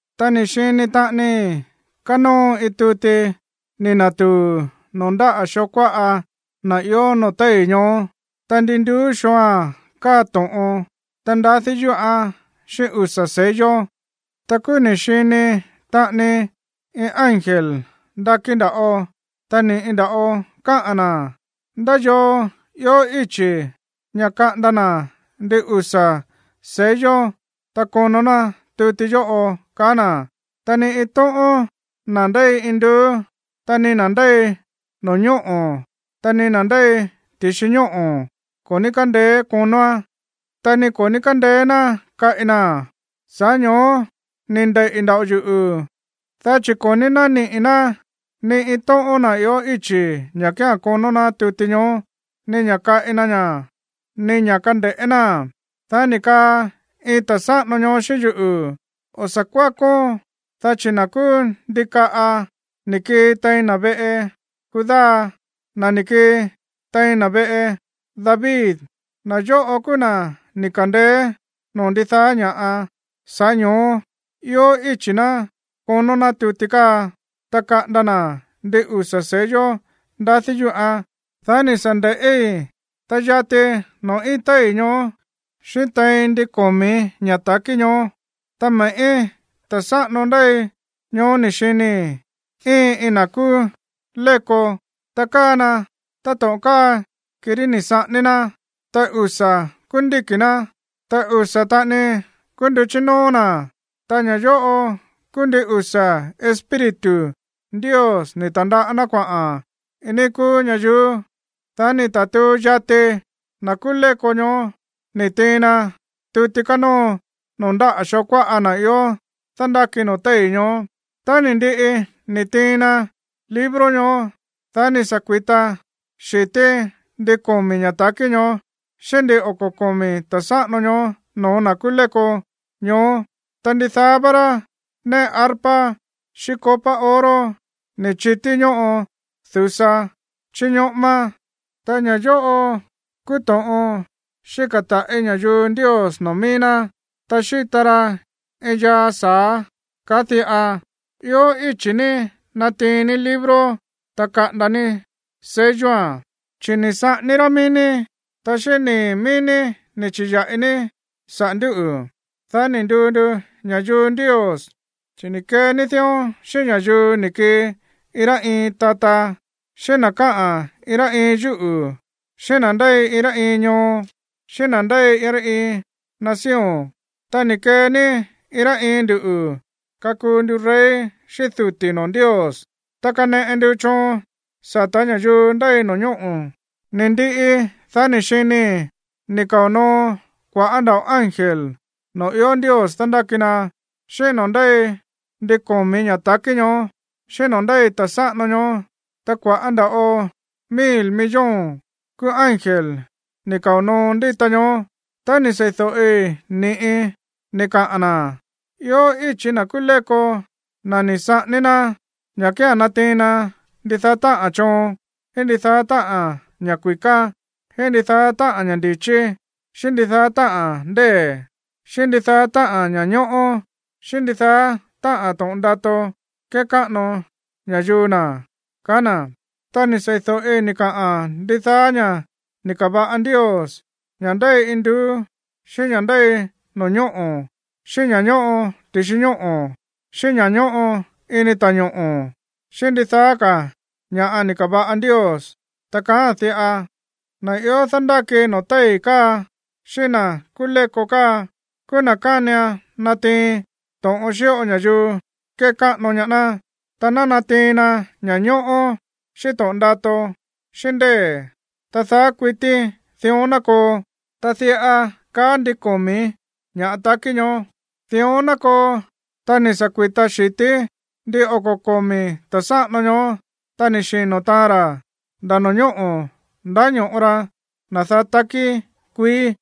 Ta ni̱ xini taꞌanii kánóo iin tuti ni̱ na̱tuu̱ noo̱ ndáꞌa̱ xoo kuáꞌa na̱ ió noo̱ téi̱ ñoó, ta ndi nduú xooa̱n káa to̱ꞌon, ta ndadí yúꞌán xíꞌín usa̱ sello. Ta kúú ni̱ xini taꞌanii iin ángel ndakí nda̱ꞌo, ta ni̱ꞌi nda̱ꞌo káꞌa̱n na̱: ―¿Ndá yoo ió íchi̱ ña̱ kaꞌanda na̱ ndin usa̱ sello, ta konó ná tuti yóꞌo? ―kaá na̱. Ta ni iin tóꞌón na̱ ndéi induú, ta ni na̱ ndéi no̱ñóꞌo̱, ta ni na̱ ndéi ti̱xi ñóꞌo̱ ko̱ ní kándeé konóán, ta ni ko̱ ní kándeé ná kaꞌi naa̱n. Sa̱ꞌá ño̱ó ni̱ ndeiꞌi̱ nda̱ꞌo yuꞌu̱, dá chi̱ ko̱ ní nániꞌi̱ ná ni iin tóꞌón na̱ ió íchi̱ ña̱ kía̱n konó ná tuti ñoó, ni ña̱ kaꞌi na ña̱, ni ña̱ kande̱ꞌé náa̱n. Dá ni̱ kaa iin ta̱ sáꞌano ñoó xíꞌín yuꞌu̱: ―O̱ sa̱ kuákón, dá chi̱ na̱ kúú ndikaꞌa ni̱ kii tein na̱ veꞌe Judá, na̱ ni̱ kii tein na̱ veꞌe David, na̱ yóꞌo kúú na̱ ni̱ ka̱ndeé noo̱ ndidaá ña̱ꞌa, sa̱ꞌá ño̱ó ió íchi̱ ná konó ná tuti káa, ta kaꞌanda na̱ ndin usa̱ sello ndadí yúꞌán. Dá ni̱ sa̱ nde̱ꞌí, ta yati noo̱ íin téi̱ ñoó, xíꞌín tein ndin komi̱ ña̱ ta̱kí ñoó, ta me̱ꞌí ta̱ sáꞌano ndéi ñoó ni̱ xinii̱ íin iin na̱ kúú léko. Ta káa na táto̱ꞌon káa kirí ni̱ saꞌání ná. Ta usa̱ kúú ndíki̱ ná, ta usa̱ taꞌani kúú nduchí nóó na̱, ta ña̱ yóꞌo kúú ndin usa̱ Espíritu Ndios ni̱ ta̱ndaꞌá ná kuaꞌa̱n iin níí kúú ñayuú. Dá ni̱ ta̱tuu yati na̱ kúú léko ñoó ni̱ tiin na tuti kánóo noo̱ ndáꞌa̱ xoo kuáꞌa na̱ ió dándáki noo̱ téi̱ ñoó. Tá ni̱ ndiꞌi ni̱ tiin na libro ñoó, dá ni̱ sa̱ kui̱ta xi̱tí ndin komi̱ ña̱ ta̱kí ñoó xíꞌín ndin oko̱ komi̱ ta̱ sáꞌano ñoó no̱ó na̱ kúú léko ñoó. Ta ndidaá vá rá néꞌe arpa xíꞌín copa oro ni̱ chití ñóꞌo du̱sa chíñoꞌómá, ta ña̱ yóꞌo kúú to̱ꞌon xíka̱ taꞌi̱ ña̱yuu Ndios noo̱ mií ná. Ta xíta ra iin yaa sa̱á káꞌa̱n diꞌa: Ió íchi̱ ní natiin ní libro, ta kaꞌanda ní selloa̱n, chi̱ ni̱ saꞌání rá mií ní, ta xíꞌín nii̱ mií ní ni̱ chi̱ya̱ꞌi ní saꞌa̱ ndúꞌu̱, dá ni̱ nduu ndu ña̱yuu Ndios. Chi̱ ni̱ kee ní dión xíꞌín ña̱yuu ni̱ kii iin rá iin tata, xíꞌín na̱ káꞌa̱n iin rá iin yúꞌu̱, xíꞌín na̱ ndéi iin rá iin ñoo, xíꞌín na̱ ndéi iin rá iin nación. Ta ni̱ kee ní iin rá iin nduꞌu̱ kakuu ndu rey xíꞌín duti̱ noo̱ Ndios, ta kaneꞌe ndu choon sa̱tá ña̱yuu ndéi no̱ñóꞌo̱. Ni̱ ndiꞌi, dá ni̱ xinii̱ ni̱ kao̱ noo kua̱ꞌá nda̱ꞌo ángel noo̱ ió Ndios dándáki na, xíꞌín noo̱ ndéi ndin komi̱ ña̱ ta̱kí ñoó, xíꞌín noo̱ ndéi ta̱ sáꞌano ñoó. Ta kua̱ꞌá nda̱ꞌo mil millón kúú ángel ni̱ kao̱ noo ndíta ñoó. Ta ni̱ sei̱do̱ꞌi ni̱ꞌi ni̱ kaꞌa̱n na̱: Ió íchi̱ na̱ kúú léko, na̱ ni̱ saꞌání rá, ña̱ kía̱n natiin na ndidaá táꞌa̱n choon, xíꞌín ndidaá táꞌa̱n ña̱ kui̱ká, xíꞌín ndidaá táꞌa̱n ña̱ ndi̱chí, xíꞌín ndidaá táꞌa̱n ndée̱, xíꞌín ndidaá táꞌa̱n ña̱ñóꞌó, xíꞌín ndidaá táꞌa̱n to̱ꞌon ndato kekáꞌano ña̱yuu na̱. Ta ni̱ sei̱do̱ꞌi ni̱ kaꞌa̱n ndidaá ña̱ ni̱ ka̱va̱ꞌa Ndios, ña̱ ndéi induú, xíꞌín ña̱ ndéi no̱ñóꞌo̱ xíꞌín ña̱ ñóꞌo ti̱xi ñóꞌo̱, xíꞌín ña̱ ñóꞌo ini ta̱ñoꞌo̱, xíꞌín ndidaá ka̱ ña̱ꞌa ni̱ ka̱va̱ꞌa Ndios, ta kaáa̱n diꞌa: Na̱ ió dándáki noo̱ téi̱ káa xíꞌín na̱ kúú léko káa kúú na̱ kánian natiin to̱ꞌon xíꞌo ña̱yuu kekáꞌano ñaá ná, ta ná natiin na ña̱ñóꞌó, xíꞌín to̱ꞌon ndato, xíꞌín ndée̱, ta daá kuití dión ná koo. Ta diꞌa káꞌa̱n ndin komi̱ ña̱ ta̱kí ñoó: ―Dión ná koo. Ta ni̱ sa̱ kui̱ta xi̱tí ndin oko̱ komi̱ ta̱ sáꞌano ñoó, ta ni̱ xino̱ taan ra̱ nda̱ no̱ñóꞌo̱ ndáño̱ꞌo ra na̱ daá takí kuií.